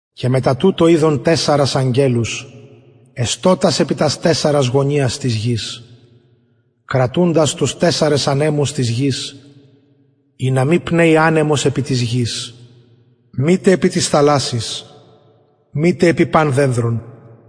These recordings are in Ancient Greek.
και μετα τουτο ειδον τεσσαρας αγγελους εστωτας επι τας τεσσαρας γωνιας της γης κρατουντας τους τεσσαρας ανεμους της γης ινα μη πνεη ανεμος επι της γης μητε επι της θαλασσης μητε επι τι δενδρον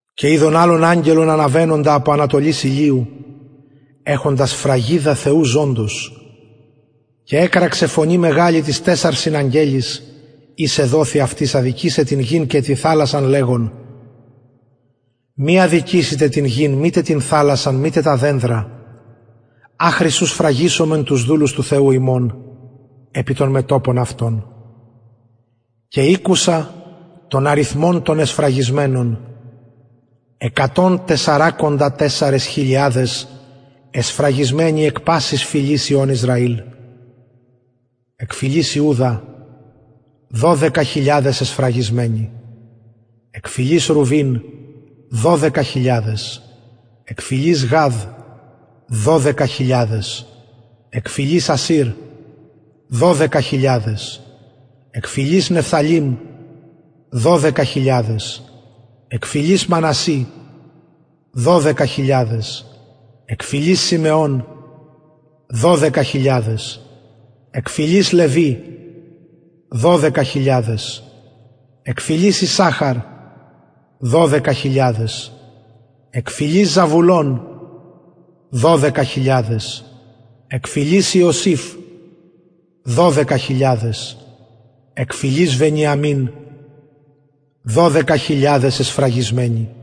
και ειδον αλλον αγγελον αναβαινοντα απο ανατολης ηλιου εχοντα σφραγιδα θεου ζωντος και εκραξεν φωνη μεγαλη τοις τεσσαρσιν αγγελοις οις εδοθη αυτοις αδικησαι την γην και την θαλασσαν λεγων μη αδικησητε την γην μητε την θαλασσαν μητε τα δενδρα αχρι ου σφραγισωμεν τους δουλους του θεου ημων επι των μετωπων αυτων και ηκουσα τον αριθμον των εσφραγισμενων εκατον και τεσσαρακοντα τεσσαρες χιλιαδες εσφραγισμενων εκ πασης φυλης υιων ισραηλ εκ φυλης ιουδα δωδεκα χιλιαδες εσφραγισμεναι εκ φυλης ρουβιμ δωδεκα χιλιαδες εκ φυλης γαδ δωδεκα χιλιαδες εκ φυλης ασηρ δωδεκα χιλιαδες εκ φυλης νεφθαλειμ δωδεκα χιλιαδες εκ φυλης μανασση δωδεκα χιλιαδες εκ φυλης συμεων δωδεκα χιλιαδες εκ φυλης λευι δωδεκα χιλιαδες εκ φυλης ισαχαρ δωδεκα χιλιαδες εκ φυλης ζαβουλων δωδεκα χιλιαδες εκ φυλης ιωσηφ δωδεκα χιλιαδες εκ φυλης βενιαμιν δωδεκα χιλιαδες εσφραγισμεναι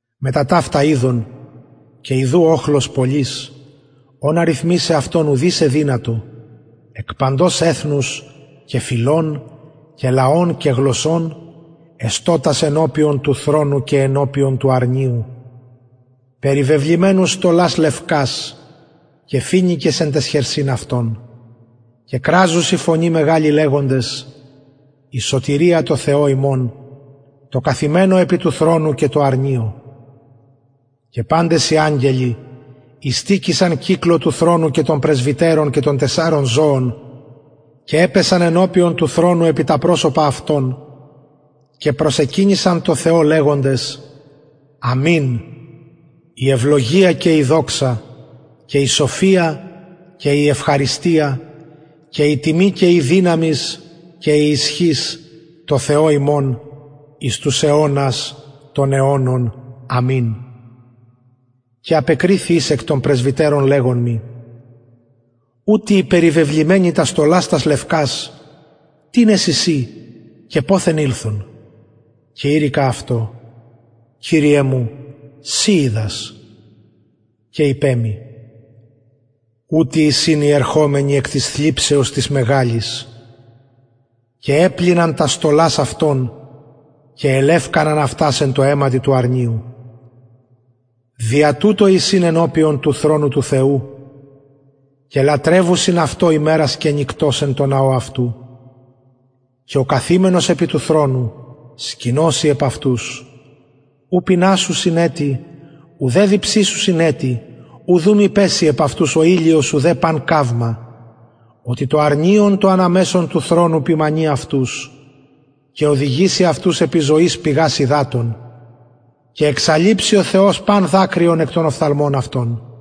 μετα ταυτα ειδον και ιδου οχλος πολυς ον αριθμησαι ουδεις εδυνατο εκ παντος εθνους και φυλων και λαων και γλωσσων εστωτας ενωπιον του θρονου και ενωπιον του αρνιου περιβεβλημενους στολας λευκας και φοινικας εν ταις χερσιν αυτων και κραζουσιν φωνη μεγαλη λεγοντες η σωτηρια τω θεω ημων τω καθημενω επι τω θρονω και τω αρνιω και παντες οι αγγελοι ειστηκεισαν κυκλω του θρονου και των πρεσβυτερων και των τεσσαρων ζωων και επεσον ενωπιον του θρονου επι τα προσωπα αυτων και προσεκυνησαν τω θεω λεγοντες αμην η ευλογια και η δοξα και η σοφια και η ευχαριστια και η τιμη και η δυναμις και η ισχυς τω θεω ημων εις τους αιωνας των αιωνων αμην και απεκριθη εις εκ των πρεσβυτερων λεγων μοι ουτοι οι περιβεβλημενοι τας στολας τας λευκας τινες εισιν και ποθεν ηλθον και ειπον αυτω κυριε μου συ οιδας και ειπεν μοι ουτοι εισιν οι ερχομενοι εκ της θλιψεως της μεγαλης και επλυναν τας στολας αυτων και ελευκαναν εν τω αιματι του αρνιου δια τουτο εισιν ενωπιον του θρονου του θεου και λατρευουσιν αυτω ημερας και νυκτος εν τω ναω αυτου και ο καθημενος επι τω θρονω σκηνωσει επ αυτους ου πεινασουσιν ετι ουδε διψησουσιν ετι ουδ ου μη πεση επ αυτους ο ηλιος ουδε παν καυμα οτι το αρνιον το ανα μεσον του θρονου ποιμαινει αυτους και οδηγει αυτους επι ζωης πηγας υδατων και εξαλειψει ο θεος παν δακρυον εκ των οφθαλμων αυτων